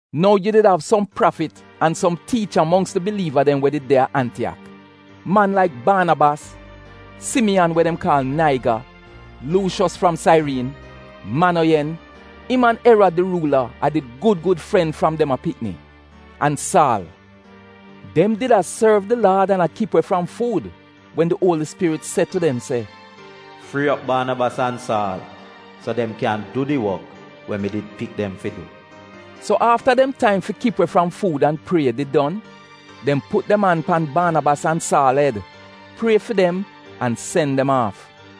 Nou yu did av som prafit an som tiicha mongks di biliiva dem we did a Antiyak: man laik Baanabas, Simiyan we dem kaal Naiga, Luushos fram Sairiin, Manoyen (im an Erad di ruula a did gud gud fren fram dem a pikni) an Saal. Dem did a sorv di Laad an a kip we fram fuud wen di Uoli Spirit se tu dem se, “Frii op Baanabas an Saal so dem kyan du di wok we mi did pik dem fi du.” So afta dem taim fi kip we fram fuud an prie did don, dem put dem an pan Baanabas an Saal ed, prie fi dem, an sen dem aaf.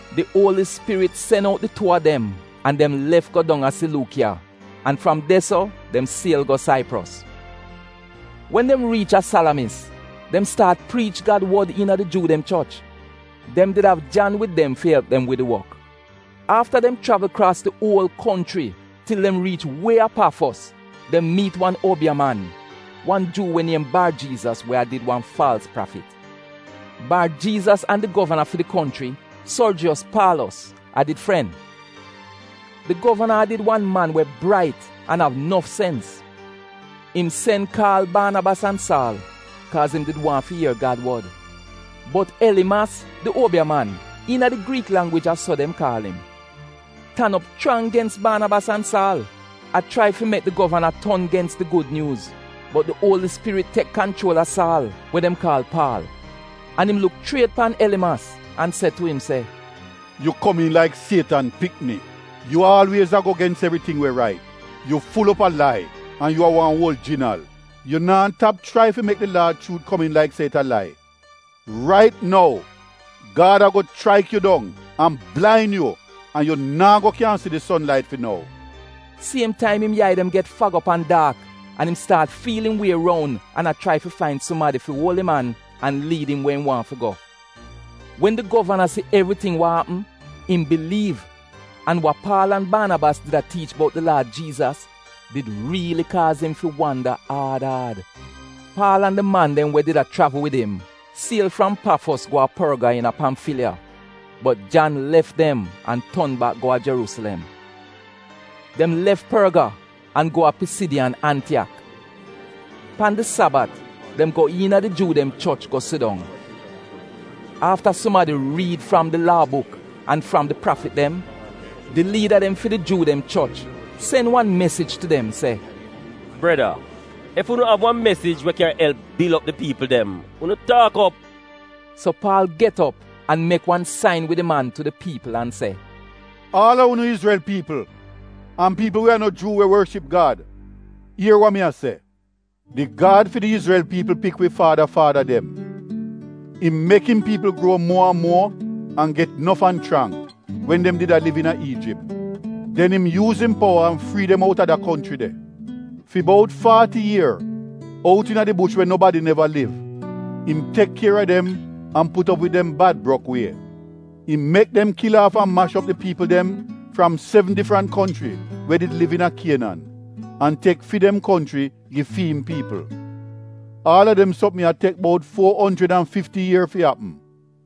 Di Uoli Spirit sen out di tuu a dem an dem lef go dong a Siluukiya an fram de so dem siel go Saipros. Wen dem riich a Salamis, dem staat priich Gad wod iina di Juu dem choch. (Dem did av Jan wid dem fi elp dem wid di wok). Afta dem chravl kraas di uol konchri til dem riich wie a Pafos, dem miit wan uobiya man, wan Juu we niem Bar-Jiizas we a did wan faalz prafit. Bar-Jiizas an di govana fi di konchri, Sorjiyos Paalos, a did fren. Di govana a did wan man we brait an av nof sens. Im sen kaal Baanabas an Saal, kaaz im did waahn fi ier Gad wod. Bot Elimas di uobiya man (iina di Griik langwij a so dem kaal im) tan op chrang gens Baanabas an Saal, a chrai fi mek di govana ton gens di gud nyuuz. Bot di Uoli Spirit tek kanchuol a Saal (we dem kaal Paal), an im luk chriet pan Elimas an se tu im se, “Yu komiin laik Sietan pikni! Yu aalwiez a go gens evriting we rait! Yu ful op a lai an yu a wan uol jinal. Yu naa tap chrai fi mek di Laad chuut komiin laik se it a lai? Rait nou Gad ago chraik yu dong an blain yu an yu naa go kyan si di son lait fi nou.” Siem taim im yai dem get fag op an daak an im staat fiil im wie roun an a chrai fi fain sumadi fi uol im an an liid im we im waahn fi go. Wen di govana si evriting wa apm, im biliiv, an wa Paal an Baanabas did a tiich bout di Laad Jiizas did riili kaaz im fi wanda aad aad. Paal an di man dem we did a chravl wid im siel fram Pafos go a Porga iina Pamfiliya, bot Jan lef dem an ton bak go a Jeruusilem. Dem lef Porga an go a Pisidiyan Antiyak. Pan di Sabat dem go iina di Juu dem choch go sidong. Afta sumadi riid fram di Laa buk an fram di Prafit dem, di liida dem fi di Juu dem choch sen wan mesij tu dem se, “Breda, ef unu av wan mesij we kyan elp bil op di piipl dem unu taak op.” So Paal get op an mek wan sain wid im an tu di piipl an se, “Aal a unu Izrel piipl an piipl we a no Juu we worship Gad, ier wa mi a se! Di Gad fi di Izrel piipl pik wi faada faada dem. Im mek im piipl gruo muo an muo an get nof an chrang wen dem did a liv iina Iijip. Den im yuuz im powa an frii dem out a da konchri de. Fi bout faati ier, out iina di bush we nobadi neva liv, im tek kier a dem an put op wid dem bad brok wie. Im mek dem kil aaf an mash op di piipl dem fram sevn difrant konchri we did liv iina Kienan an tek fi dem konchri gi fi'im piipl. Aal a dem sopm ya tek bout fuo onjrid an fifti ier fi apm.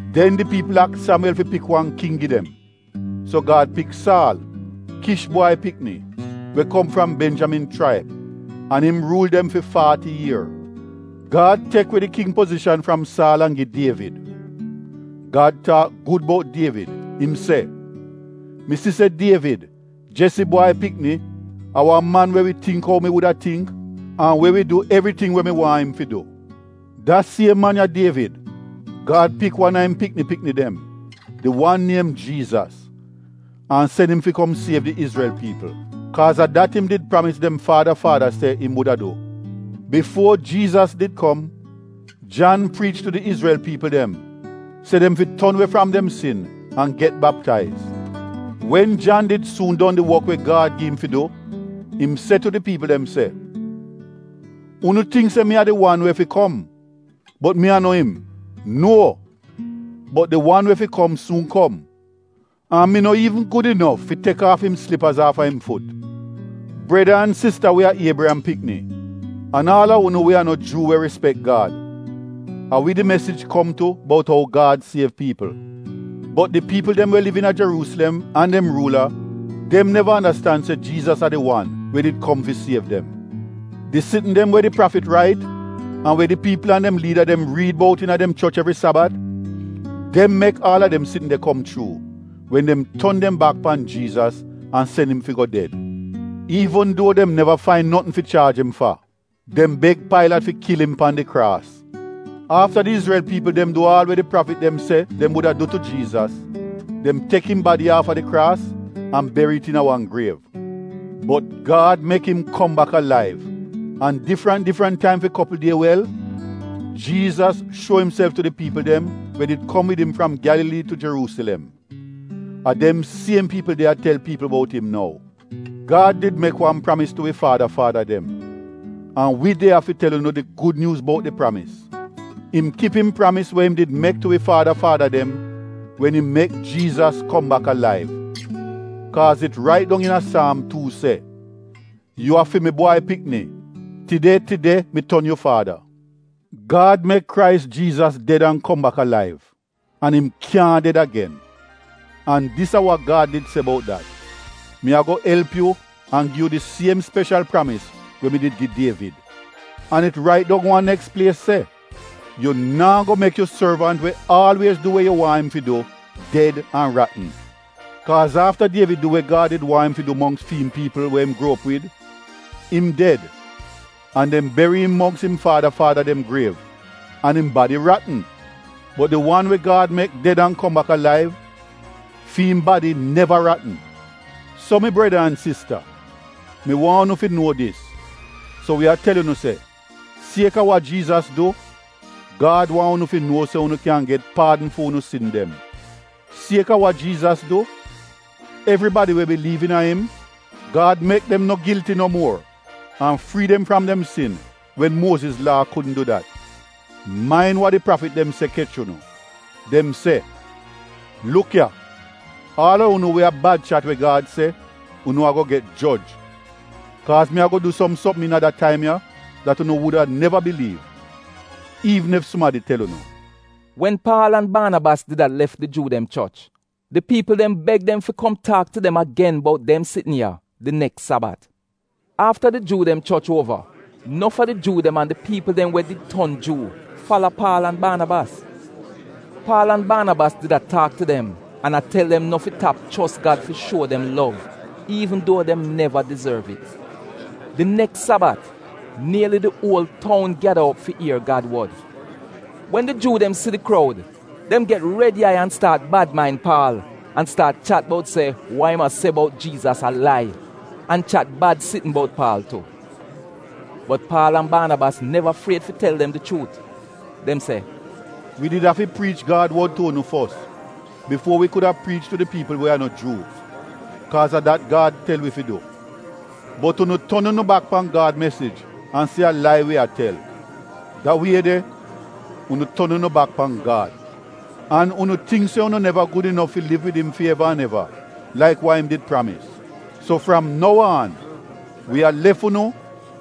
Den di piipl aks Samiwel fi pik wan king gi dem. So Gad pik Saal, Kish bwai pikni, we kom fram Benjamin chraib, an im ruul dem fi faati ier. Gad tek we di king pozishan fram Saal an gi Dievid. Gad taak gud bout Dievid, im se, ‘Mi si se Dievid, Jesi bwai pikni a wan man we wi tingk ou mi wuda tingk an we wi du evriting we mi waahn im fi du.’ “Da siem man ya, Dievid, Gad pik wan a im pikni pikni dem, di wan niem Jiizas, an sen im fi kom siev di Izrel piipl, kaaz a dat im did pramis dem faada faada se im wuda du. Bifuo Jiizas did kom Jan priich tu di Izrel Piipl dem se dem fi ton we fram dem sin an get baptaiz. Wen Jan did suun don di wok we Gad gi im fi du im se tu di piipl dem se, ‘Unu tingk se mi a di wan we fi kom, bot mi a no im. Nuo! Bot di wan we fi kom suun kom, an mi no iivn gud inof fi tek aaf im slipaz aaf a im fut.’ “Breda an sista we a Iebriyam pikni, an aal a unu we a no Juu we rispek Gad, a wi di mesij kom tu bout ou Gad siev piipl. Bot di piipl dem we liv iina Jeruusilem an dem ruula dem neva andastan se Jiizas a di wan we did kom fi siev dem. Di sitn dem we di prafit rait an we di piipl an dem liida dem riid bout iina dem choch evri Sabat, dem mek aal a dem sitn de kom chuu wen dem ton dem bak pan Jiizas an sen im fi go ded. Iivn duo dem neva fain notn fi chaaj im fa, dem beg Pailat fi kil pan di kraas. Afta di Izrel piipl dem du aal we di prafit dem se dem wuda du tu Jiizas, dem tek im badi aafa di kraas an beri it iina wan griev. Bot Gad mek im kom bak alaiv, an difrant difrant taim fi kopl die wel Jiizas shuo imself tu di piipl dem we did kom wid im fram Gyalalii tu Jeruusilem. A dem siem piipl de a tel piipl bout im nou. “Gad did mek wan pramis tu wi faada faada dem. An wi de ya fi tel unu di gud nyuuz bout di pramis. Im kip im pramis we im did mek tu wi faada faada dem wen im mek Jiizas kom bak alaiv. Kaaz it rait dong iina Saam tuu se, “‘Yu a fi mi bwai pikni; tide tide mi ton yu faada.’ Gad mek Krais Jiizas ded an kom bak alaiv, an im kyaahn ded agen. An dis a wa Gad did se bout dat: “‘Mi ago elp yu an gi yu di siem speshal pramis we mi did gi Dievid.’ An it rait dong wan neks plies se: “‘Yu naa go mek yu sorvant we aalwiez du we yu waahn im fi du ded an ratn.’ “Kaaz afta Dievid du we Gad did waahn im fi du mongks fi'im piipl we im gruo op wid, im ded an dem beri im mongks im faada faada dem griev an im badi ratn. Bot di wan we Gad mek ded an kom bak alaiv, fi'im badi neva ratn. “So mi breda an sista, mi waahn unu fi nuo dis, so wi a tel unu se, sieka wa Jiizas du, Gad waahn unu fi nuo se unu kyan get paadn fu'unu sin dem. Sieka wa Jiizas du, evribadi we biliiv iina im, Gad mek dem no gilti no muor an frii dem fram dem sin wen Muoziz Laa kudn du dat. Main wa di prafit dem se kech unu: dem se, “‘Luk ya, aal a unu we a bad chat we Gad se, unu ago get joj. Kaaz mi ago du som sopm iina da taim ya dat unu wuda neva biliiv, iivn ef sumadi tel unu.’” Wen Paal an Baanabas did a lef di Juu dem choch, di piipl dem beg dem fi kom taak tu dem agen bout dem sitn ya di neks Sabat. Afta di Juu dem choch uova, nof a di Juu dem an di piipl dem we did ton Juu fala Paal an Baanabas. Paal an Baanabas did a taak tu dem an a tel dem no fi tap chos Gad fi shuo dem lov iivn duo dem neva dizorv it. Di neks Sabat, nieli di uol toun gyada op fi ier Gad wod. Wen di Juu dem si di kroud, dem get red yai an staat bad main Paal, an staat chat bout se wa im a se bout Jiizas a lai, an chat bad sitn bout Paal tu. Bot Paal an Baanabas neva fried fi tel dem di chuut. Dem se, “Wi did afi priich Gad wod tu unu fos bifuo wi kuda priich tu di piipl we a no Juu, kaaz a dat Gad tel wi fi du. Bot unu ton unu bak pan Gad mesij an se a lai wi a tel. Da wie de unu ton unu bak pan Gad. An unu tingk se unu neva gud inof fi liv wid im fi eva an eva laik wa im did pramis. So fram nou aan, wi a lef unu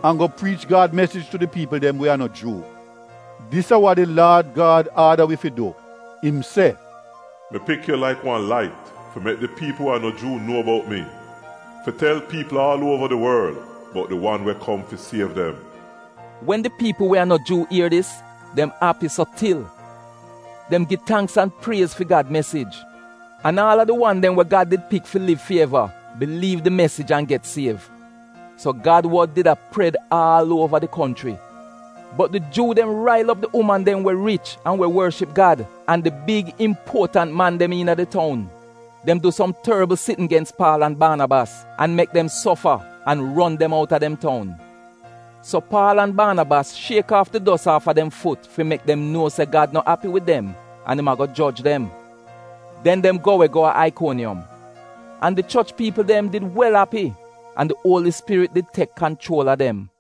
an go priich Gad mesij tu di piipl dem we a no Juu. Dis a wa di Laad Gad aada wi fi du, im se: “‘Mi pik yu laik wan lait fi mek di piipl we a no Juu nuo bout mi, fi tel piipl aal uova di worl bout di wan we kom fi siev dem.’” Wen di piipl we a no Juu ier dis, dem api so til. Dem gi tangks an priez fi Gad mesij. An aal a di wan dem we Gad did pik fi liv fi eva biliiv di mesij an get siev. So Gad wod did a pred aal uova di konchri. Bot di Juu dem rail op di uman dem we rich an we worship Gad, an di big impuotant man dem iina di toun. Dem du som torbl sitn gens Paal an Baanabas an mek dem sofa an ron dem outa dem toun. So Paal an Baanabas shiek aaf di dos aaf a dem fut fi mek dem nuo se Gad no api wid dem an im ago joj dem. Den dem go we go a Aikoniyom. An di choch piipl dem did wel api an di Uoli Spirit did tek kanchuol a dem.